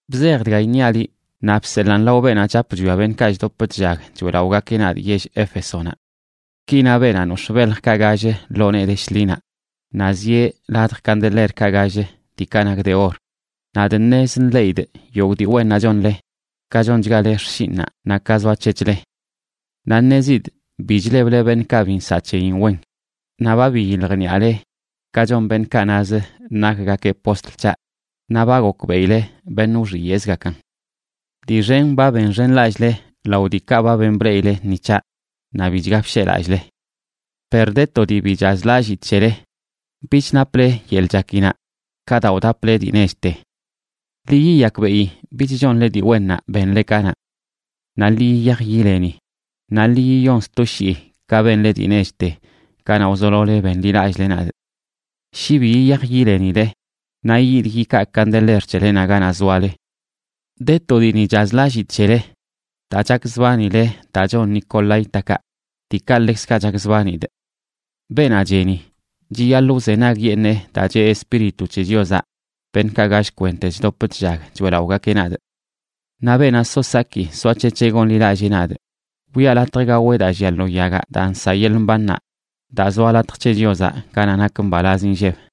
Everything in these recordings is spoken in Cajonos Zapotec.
’Bzej dga iṉiaꞌ liꞌ naꞌ bseḻaan lao beenaꞌ chap chwia beṉꞌkaꞌ chdop chllag choeꞌlaꞌogakeꞌ nadꞌ yell Éfesonaꞌ: “Ki na beenaꞌ nox̱ꞌ beljkaꞌ gall lo nee de shḻinaꞌ, naꞌ zieꞌ ladj candelerkaꞌ gall, diikaꞌ nak de or: Nadꞌ ṉez nḻeꞌidꞌ yogꞌ dii wennaꞌ chonle, ka chonchgale xshinꞌnaꞌ naꞌ ka zoac̱hec̱hle. Naꞌ ṉezidꞌ bi chleble beṉꞌkaꞌ bi nsaꞌ c̱heyin wen, naꞌ ba biyiljniꞌale ka chon beṉꞌkaꞌ nazə nakgakeꞌ postl c̱haꞌ naꞌ ba gokbeꞌile beṉꞌ wxiyeꞌzgakan. Dii xen ba benxenlallꞌle lao diikaꞌ ba ben bleꞌile ni c̱haꞌ, naꞌ bichga bsheꞌlallꞌle. Per de to dii bi chazlallidꞌ c̱hele: bich naple yeḻꞌ chakinaꞌ ka daa wdaple dii nechte. Ḻi yiyakbeꞌi bich chonle dii wennaꞌ benle kanaꞌ. Naꞌ ḻi yiyaj yileni naꞌ ḻi yiyon sto shii ka benle dii nechte kanaꞌ wzolole benḻilallꞌle nadꞌ. Shi bi yiyaj yilenile, naꞌ yidꞌ yikaa candeler c̱helenaꞌ ganaꞌ zoale. De to dii ni chazlallidꞌ c̱hele: daa chakzbanile daa chon nicolaítakaꞌ, diikaꞌ ḻekzkaꞌ chakzbanidꞌ. Beenaꞌ cheni, chiyaḻꞌ wzenagyeṉee daa cheꞌ Espíritu c̱he Chiozaꞌ beṉꞌkaꞌ gall kwente chdop chllag choeꞌlaꞌogakeꞌ nadꞌ. Naꞌ beenaꞌ so saki soac̱hec̱heꞌ gonḻilallee nadꞌ, wiꞌa latj gaweꞌ daa llia lo yagaꞌ daa nsaꞌ yeḻꞌ mbannaꞌ, daa zoa latj c̱he Chiozaꞌ ganaꞌ nak mbalaz inlleb.”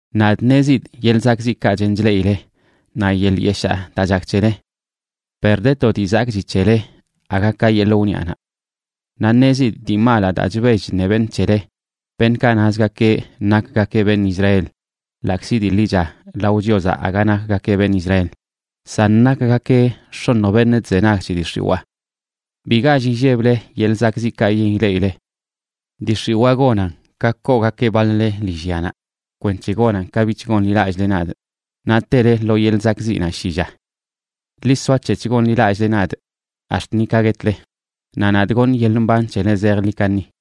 Nadꞌ ṉezidꞌ yeḻꞌ zakꞌziꞌkaꞌ chen chleꞌile naꞌ yeḻꞌ yeshaa daa chak c̱hele. Per de to dii zakꞌchi c̱hele aga ka yeḻꞌ wniꞌanaꞌ. Naꞌ ṉezidꞌ dii malaꞌ daa chbell chṉe beṉꞌ c̱hele, beṉꞌkaꞌ nazgakeꞌ nakgakeꞌ beṉꞌ Israel, ḻaꞌkzi dii ḻicha lao Chiozaꞌ aga nakgakeꞌ beṉꞌ Israel, san nakgakeꞌ x̱oṉj beṉꞌ chzenag c̱he dii x̱iwaa. Bi gall illeble yeḻꞌ zakꞌziꞌkaꞌ yen ileꞌile. Dii x̱iwaa gonan ka koogakeꞌ baḻ-le lillyanaꞌ kwenc̱he gonan ka bich gonḻilallꞌle nadꞌ, naꞌ tele lo yeḻꞌ zakꞌziꞌnaꞌ shi lla. Ḻi soac̱hec̱h gonḻilallꞌle nadꞌ ax̱t ni ka guetle, naꞌ nadꞌ goṉꞌ yeḻꞌ mban c̱hele zejḻi kaṉi.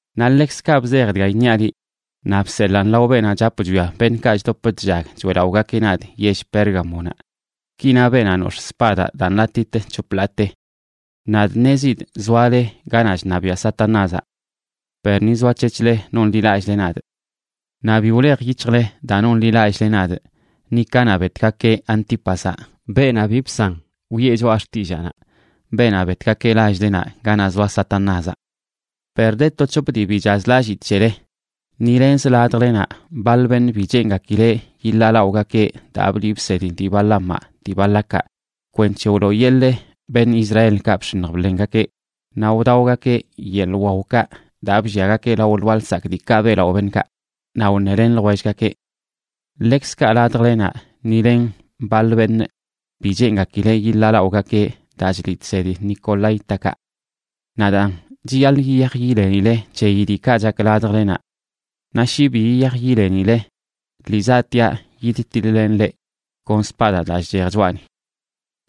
’Naꞌ ḻekzkaꞌ bzej dga iṉiaꞌ liꞌ naꞌ bseḻaan lao beenaꞌ chap chwia beṉꞌkaꞌ chdop chllag choeꞌlaꞌogakeꞌ nadꞌ yell Pérgamonaꞌ: “Ki na beenaꞌ nox̱ꞌ spadaꞌ daa nḻatit c̱hop ḻaate: Nadꞌ ṉezidꞌ zoale ganaꞌ chṉabiaꞌ Satanázaꞌ, per ni zoac̱hec̱hle nonḻilallꞌle nadꞌ. Naꞌ bi wlej yic̱hjle daa nonḻilallꞌle nadꞌ, ni kanaꞌ betgakeꞌ Antípazaꞌ, beenaꞌ bi bsan wiꞌe choꞌa xtillaanaꞌ, beenaꞌ betgakeꞌ lall-lenaꞌ ganaꞌ zoa Satanázaꞌ. Per de to c̱hop dii bi chazlallidꞌ c̱hele: ni lenzə ladjlenaꞌ baḻ beṉꞌ bi cheengakileꞌ yiḻaalaꞌogakeꞌ daa bliꞌ bsedi dii Balaamaꞌ dii Balacaꞌ kwenc̱he wlooyeḻee beṉꞌ Israelkaꞌ bx̱iṉj bḻengakeꞌ, naꞌ wdaogakeꞌ yeḻꞌ waokaꞌ daa blliagakeꞌ lao lwaa lsakꞌ diikaꞌ beꞌlaꞌo beṉꞌkaꞌ, naꞌ wṉelen ljwellgakeꞌ. Ḻekzkaꞌ ladjlenaꞌ ni len baḻ beṉꞌ bi cheengakileꞌ yiḻaalaꞌogakeꞌ daa chliꞌ chsedi nicolaítakaꞌ. Naꞌ daan, chiyaḻꞌ yiyaj yilenile c̱heyi diikaꞌ chak ladjlenaꞌ. Naꞌ shi bi yiyaj yilenile, lii zaꞌtiaꞌ yidtiḻ-lenꞌ leꞌ kon spadaꞌ daa chchej choꞌani.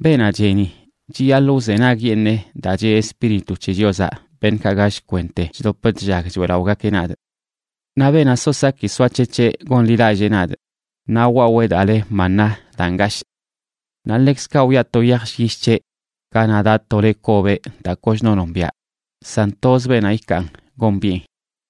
Beenaꞌ cheni, chiyaḻꞌ wzenagyeṉee daa cheꞌ Espíritu c̱he Chiozaꞌ beṉꞌkaꞌ gall kwente chdop chllag choeꞌlaꞌogakeꞌ nadꞌ. Naꞌ beenaꞌ so saki soac̱hec̱heꞌ gonḻilallee nadꞌ, naꞌ wwawee daa le maná daa ngashꞌ. Naꞌ ḻekzkaꞌ wiꞌa to yaj llyish c̱heꞌ ganaꞌ daꞌ to le kobeꞌ daa kochno nombiaꞌ, san toz beenaꞌ ikaan gombiꞌen.”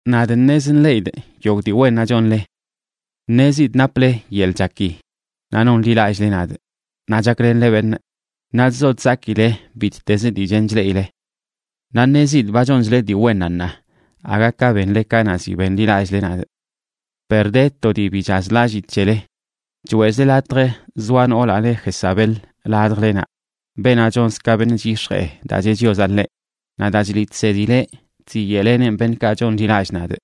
Nadꞌ ṉez nḻeꞌidꞌ yogꞌ dii wennaꞌ chonle. Ṉezidꞌ naple yeḻꞌ chaki naꞌ nonḻilallꞌle nadꞌ, naꞌ chaklenle beṉꞌ, naꞌ chzo chzakile bittezə dii chen chleꞌile. Naꞌ ṉezidꞌ ba chonchle dii wennaꞌ ṉaa aga ka benle kanaꞌ ziꞌ benḻilallꞌle nadꞌ. Per de to dii bi chazlallidꞌ c̱hele: choeꞌzle latj zoa noolaꞌ le Jezabel ladjlenaꞌ, beenaꞌ chonz ka beṉꞌ chyix̱jee daa cheꞌ Chiozaꞌ ḻeꞌ. Naꞌ daa chliꞌ chsedileꞌ chziyeꞌleneꞌn beṉꞌkaꞌ chonḻilallꞌ nadꞌ,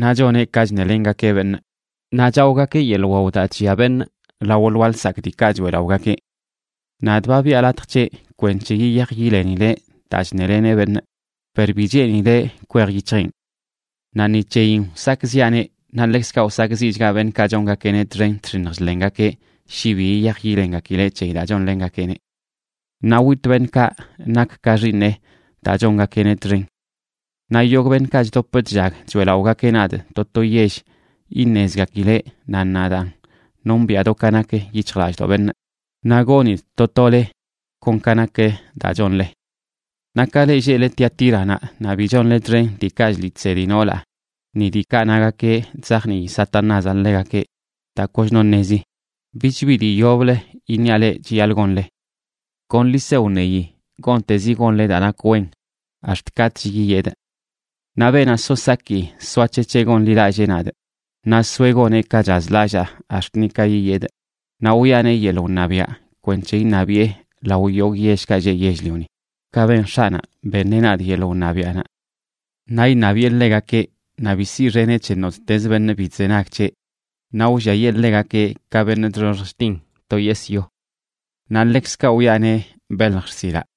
naꞌ choneꞌ ka chṉelengakeꞌ beṉꞌ naꞌ chaogakeꞌ yeḻꞌ wawaꞌ daa chllia beṉꞌ lao lwaa lsakꞌ diikaꞌ choeꞌlaꞌogakeꞌ. Nadꞌ ba biꞌa latj c̱heꞌ kwenc̱he yiyaj yilenileꞌ daa chṉeleneꞌ beṉꞌ, per bi cheenileꞌ kwej yic̱hjeꞌn. Naꞌ ni c̱heyin wsakꞌziꞌaneꞌ, naꞌ ḻekzkaꞌ wsakꞌziꞌchgaꞌ beṉꞌkaꞌ chongakeꞌneꞌ txen chx̱iṉj chḻengakeꞌ shi bi yiyaj yilengakileꞌ c̱heyi daa chonlengakeꞌneꞌ. Naꞌ witꞌ beṉꞌkaꞌ nak ka xiiṉeꞌ daa chongakeꞌneꞌ txen. Naꞌ yogꞌ beṉꞌkaꞌ chdop chllag choeꞌlaꞌogakeꞌ nadꞌ to to yell iṉezgakileꞌ nan nadaan nombiꞌa do ka nak yic̱hjlallꞌdoꞌ beṉꞌ, naꞌ gonidꞌ to tole kon ka nak daa chonle. Naꞌ ka leꞌ lleꞌle Tiatíranaꞌ naꞌ bi chonle txen diikaꞌ chliꞌ chsedi noolaꞌ ni diikaꞌ nagakeꞌ chzajnii Satanázaꞌ ḻegakeꞌ daa kochno ṉezi, bich bi dii yoblə iṉiaꞌ leꞌ chiyaḻꞌ gonle. Kon ḻi se wṉeyi gontezi gonle daa nak wen ax̱t katꞌch yiyedꞌ. Naꞌ beenaꞌ so saki soac̱hec̱heꞌ gonḻilallee nadꞌ naꞌ soeꞌ goneꞌ ka chazlallaa ax̱t ni ka yiyedꞌ, naꞌ wiꞌaneꞌ yeḻꞌ wṉabiaꞌ kwenc̱he iṉabiꞌe lao yogꞌ yellkaꞌ lleꞌ yell-lioni, ka ben X̱aꞌnaꞌ, beṉeꞌ nadꞌ yeḻꞌ wṉabiaꞌnaꞌ. Naꞌ iṉabiꞌe ḻegakeꞌ, naꞌ bi siꞌxeneꞌ c̱he nottez beṉꞌ bi chzenag c̱heꞌ, naꞌ wlliayee ḻegakeꞌ ka beṉꞌ chxoxj chtin to yesꞌ yo. Naꞌ ḻekzkaꞌ wiꞌaneꞌ belj xsilaꞌ.